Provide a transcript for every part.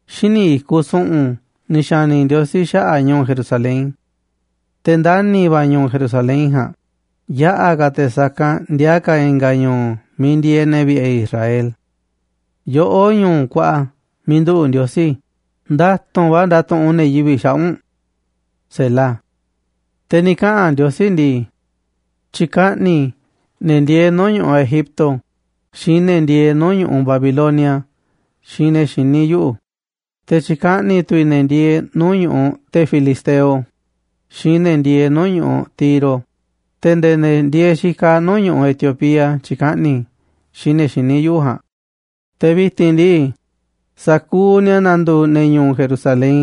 Xíniꞌ i̱kuꞌ su̱ꞌu̱n ni̱ xa̱ni̱ Ndiosí xaꞌa̱ꞌ ñu̱u̱ Jerusalén. Te̱ ndani̱ va̱ a̱ ñu̱u̱ Jerusalén ja̱a̱nꞌ, yaꞌa̱ ka̱ te̱ sa̱kanꞌ ndiaa ka̱ i̱nga̱ ñu̱u̱ miiꞌ ndieeꞌ ne̱ vi̱ꞌe̱ Israel. Yoꞌó, ñu̱u̱ kuaꞌa miiꞌ nduꞌu̱ꞌ Ndiosí, nda̱tu̱nꞌ va̱ ndatuꞌunꞌ ne̱ yivi̱ꞌ xaꞌa̱ꞌ u̱nꞌ. Te̱ ni̱ kaꞌa̱n Ndiosí ndii: “Tyi̱kaꞌni̱ i̱ ne̱ ndieeꞌ nuu̱ꞌ ñu̱ꞌuꞌ Egipto xiinꞌ ne̱ ndieeꞌ nuu̱ꞌ ñu̱ꞌuꞌ Babilonia xiinꞌ ne̱ xiní yuꞌu̱, te̱ tyi̱kaꞌni̱ tu̱ i̱ ne̱ ndieeꞌ nuu̱ꞌ ñu̱ꞌuꞌ te̱ Filisteo xiinꞌ ne̱ ndieeꞌ nuu̱ꞌ ñu̱ꞌuꞌ Tiro, te̱ nde̱e̱ ne̱ ndieeꞌ xikaꞌ nuu̱ꞌ ñu̱ꞌuꞌ Etiopía tyi̱kaꞌni̱ i̱ xiinꞌ ne̱ xiní yuꞌu̱ ja̱a̱nꞌ, te̱ vi̱ti̱n ndii, sa̱kuuꞌ ni̱a̱ na̱ndu̱u̱ ne̱ ñu̱u̱ Jerusalén”,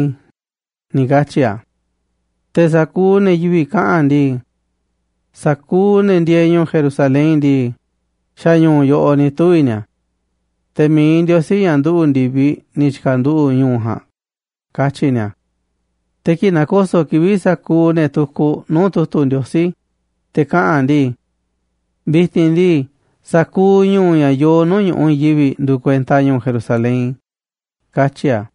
ni̱ katyi̱ a̱. Te̱ sa̱kuuꞌ ne̱ yivi̱ꞌ kaꞌa̱n ndii: “Sa̱kuuꞌ ne̱ ndieeꞌ ñu̱u̱ Jerusalén ndii, xa̱ ñu̱u̱ yoꞌoꞌ ni̱ tuvi̱ ni̱a̱. Te̱ mi̱iꞌ Ndiosí, ña̱ nduꞌu̱ꞌ ndi̱viꞌ, ni̱ tyi̱ka̱nduꞌu̱ꞌ ñu̱u̱ ja̱a̱nꞌ”, katyi̱ ni̱a̱. Te̱ kii̱ꞌ na̱ko̱so̱ꞌ kivi̱ꞌ sa̱kuuꞌ ne̱ tukuꞌ nuu̱ꞌ tu̱tu̱ Ndiosí, te̱ kaꞌa̱n a̱ ndii: “Vi̱ti̱n ndii, sa̱kuuꞌ ñu̱u̱ ña̱ yoo nuu̱ꞌ ñu̱ꞌuꞌ i̱i̱n yivi̱ꞌ nduuꞌ kuenta ñu̱u̱ Jerusalén”, katyi̱ a̱.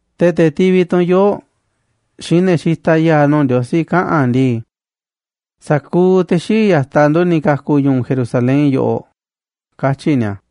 Te̱ te̱ tivi tu̱n yoo̱ꞌ xiinꞌ ne̱ xitaꞌ ya̱a̱ nuu̱ꞌ Ndiosí kaꞌa̱n ndii: “Sa̱kuuꞌ te̱ xii̱ꞌ ya̱taꞌ ndu̱ ni̱ ka̱ku̱ ñu̱u̱ Jerusalén yoꞌoꞌ”, katyi̱ ni̱a̱.